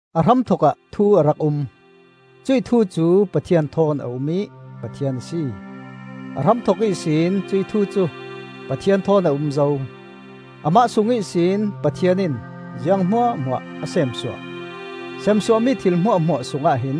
A hramthokah Thu a rak um. Cuih Thu cu Pathian thawn a um ih Pathian a si. A hramthok ihsin cuih Thu cu Pathian thawn a um zo. Amah sung ihsin Pathian in ziang hmuahhmuah a seemsuah; seemsuah mi thil hmuahhmuah sungah hin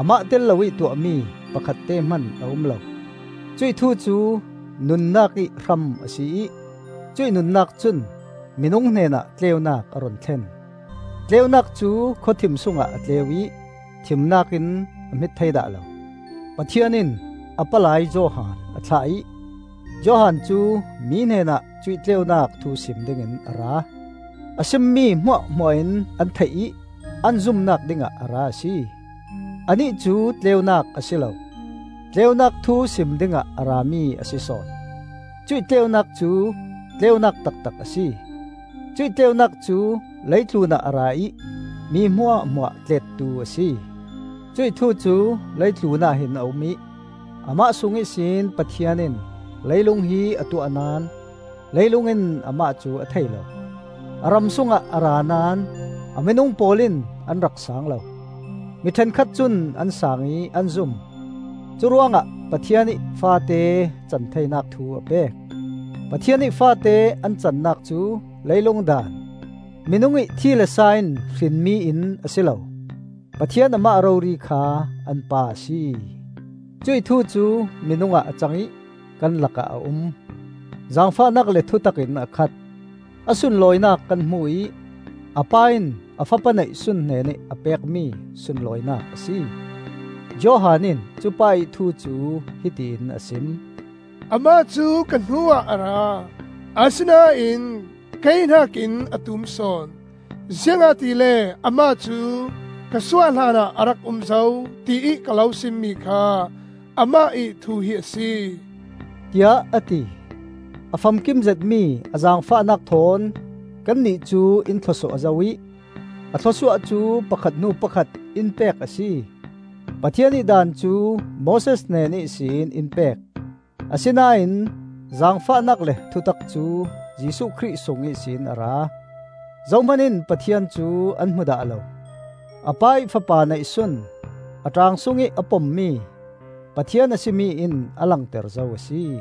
amah tel loih tuahmi pakhatte hman a um lo. Cuih Thu cu nunnak ih hram a si ih cuih nunnak cun minung hnenah tleunak a run thlen. Tleunak cu khawthim sungah a tleu ih thimnak in a hmit thei dah lo. Pathian in a palai Johan a thlah ih, Johan cu mi hnenah cuih tleunak thu sim dingin a ra. A simmi hmuahhmuah in an theih ih an zumnak dingah a ra a si. Anih cu tleunak a si lo; tleunak thu sim dingah a rami a si sawn. Cuih tleunak cu tleunak taktak a si. Cuih tleunak cu leitlun ah a ra ih mi hmuahhmuah tlettu a si. Cuih Thu cu leitlun ah hin a um ih amah sung ihsin Pathian in leilung hi a tuah naón leilung in amah cu a thei lo. A ram sungah a ra naón a minung pawl in an rak saang lo. Mi ṭhenkhat cun an saang ih an zum; curuangah Pathian ih faate cantheinak thu a pek. Pathian ih faate an cannak cu leilung daan, minung ih thi le sa in hrinmi in a si lo; Pathian amah rori kha an Pa a si. Cuih Thu cu minung ah a cang ih kan lakah a um; zaangfahnak le thutak in a khat. A sunlawinak kan hmu ih a Pa in a fapa neihsun hnenih a pekmi sunlawinak a si. Johan in cupa ih thu cu hiti in a sim: “‘Amah cu ka hnuah a ra; asinain kei hnakin a tum sawn, ziangahtile amah cu ka suah hlanah a rak um zo,’ tiih ka lo simmi kha amah ih thu hi a si,” tiah a ti. A famkim zetmi a zaangfahnak thawn kannih cu in thlawsuah zo ih a thlawsuah cu pakhat hnu pakhat in pek a si. Pathian ih Daan cu Moses hnen ihsin in pek; asinain zaangfahnak le thutak cu Jesuh Khrih sung ihsin a ra. Zohman in Pathian cu an hmu dah lo. A Pa ih Fapa neihsun, a ṭaang sungih a pommi, Pathian a si mi in a langter zo a si.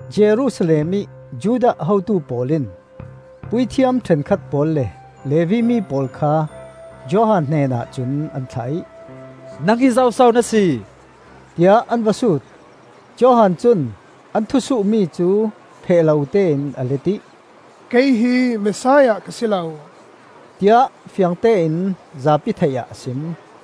Jerusalem ih Judah hotu pawl in puithiam ṭhenkhat pawl le Levi mi pawl kha Johan hnenah cun an thlah ih, “Nang hi zoso na si?” tiah an va sut. Johan cun an thusuhmi cu pheh lotein a let ih, “Kei hi Messiah ka si lo,” tiah fiangtein zapi theih ah a sim.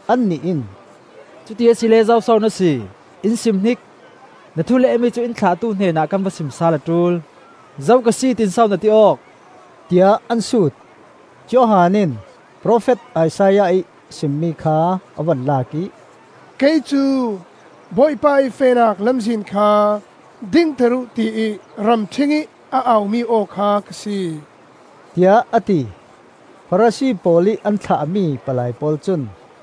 Annih in, “Cuti asile zoso na si, in simhnik. Na thu lehmi cu in thlahtu hnenah kan va sim sal a ṭul. Zo ka si, tiin so na ti awk?” tiah an sut. Johan in Profet Isaiah ih simmi kha a vun lak ih, “Kei cu ‘Bawipa ih fehnak lamzin kha dingter uh,’ tiih ramṭhingih a au-mi aw kha ka si,” tiah a ti. Farasi pawl ih an thlahmi palai pawl cun,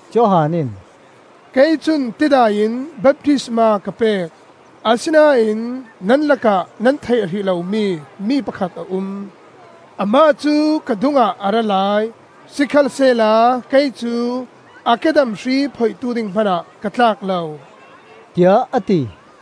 Johan in, “Kei cun tidai in baptisma ka pek, asinain nan lakah nan theih hrih lomi mi pakhat a um. Amah cu ka dungah a ra lai; sikhalsehla kei cu a kedam hri phoihtu hmanah ka tlak lo,” tiah a ti.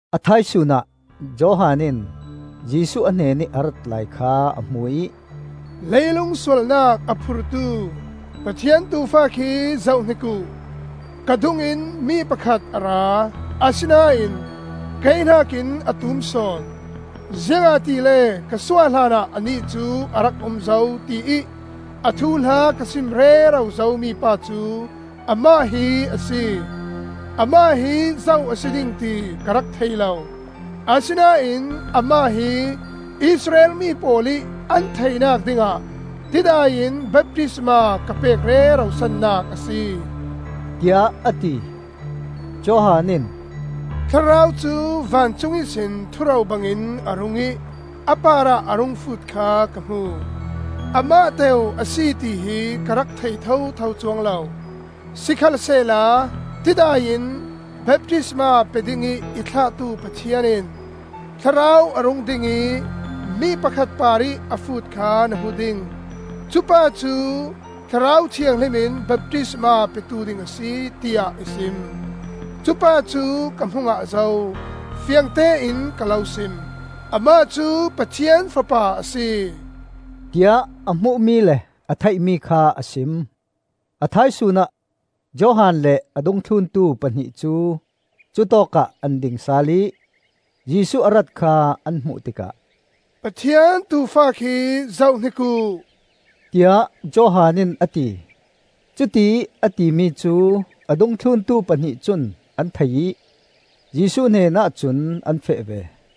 A thaisun ah Johan in Jesuh a hnenih a rat lai kha a hmu ih, “Leilung sualnak a phurtu Pathian Tuufa khi zohhnik uh! ‘Ka dungin mi pakhat a ra, asinain kei hnakin a tum sawn, ziangahtile ka suah hlanah anih cu a rak um zo,’ tiih a thuhla ka sim rero zo mipa cu amah hi a si. Amah hi zo a si ding ti ka rak thei lo. Asinain amah hi Israel mi pawl ih an theihnak dingah tidai in baptisma ka pek rero sannak a si,” tiah a ti. Johan in, “Thlarau cu vancung ihsin thuro bangin a rung ih a parah a rung fut kha ka hmu. Amah teu a si tihi ka rak thei thotho cuang lo, sikhalsehla tidai in baptisma pe dingih i thlahtu Pathian in ‘Thlarau a rung ding ih mi pakhat parih a fut kha na hmu ding; cupa cu Thlarau Thianghlim in baptisma petu ding a si,’ tiah i sim. Cupa cu ka hmu ngah zo. Fiangtein ka lo sim: Amah cu Pathian Fapa a si,” tiah a hmuhmi le a theihmi kha a sim. A thaisun ah Johan le a dungthluntu pahnih cu cutawk ah an ding sal ih, Jesuh a rat kha an hmuh tikah, “Pathian Tuufa khi zohhnik uh,” tiah Johan in a ti. Cutiih a timi cu a dungthluntu pahnih cun an thei ih Jesuh hnenah cun an feh ve.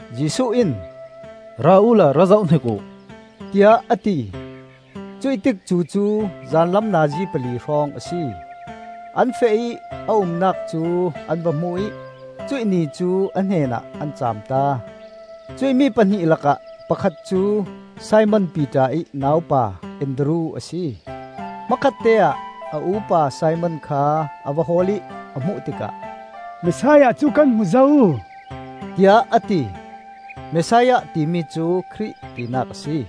Jesuh in, “Ra uhla ra zohhnik uh,” tiah a ti. Cuih tikcu cu zanlam nazi pali hrawng a si. An feh ih a umnak cu an va hmu ih cuih ni cu a hnenah an caam ta. Cuih mi pahnih lakah pakhat cu Simon Piter ih naupa Andru a si. Hmakhatteah a u-pa Simon kha a va hawl ih a hmuh tikah, “Messiah cu kan hmu zo,” tiah a ti. Messiah timi cu Khrih tinak a si.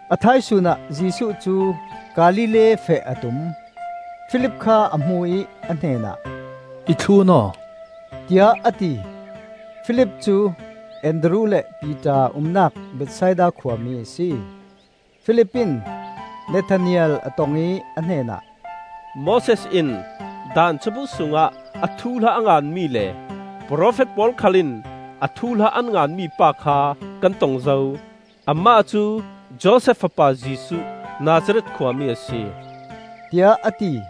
A thaisun ah Jesuh cu Galilee feh a tum. Filip kha a hmu ih a hnenah, “I thlun aw,” tiah a ti. Filip cu Andru le Piter umnak Bethsaida khua mi a si. Filip in Nathanael a tong ih a hnenah, “Moses in Daan cabu sungah a thuhla a nganmi le profet pawl khal in a thuhla an ngan mipa kha kan tong zo. Amah cu Josef fapa Jesuh, Nazareth khuami a si,” tiah a ti.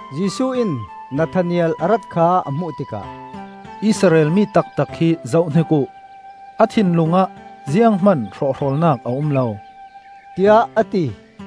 Jesuh in Nathanael a rat kha a hmuh tikah, “Israel mi taktak hi zohhnik uh! A thinlung ah zianghman hrawhhrawlnak a um lo,” tiah a ti.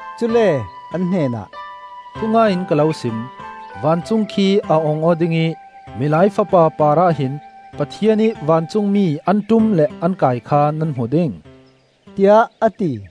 Cule an hnenah, “Thungai in ka lo sim: vancung khi a ong aw ding ih Milai Fapa parah hin Pathian ih vancungmi an ṭum le an kai kha nan hmu ding,” tiah a ti.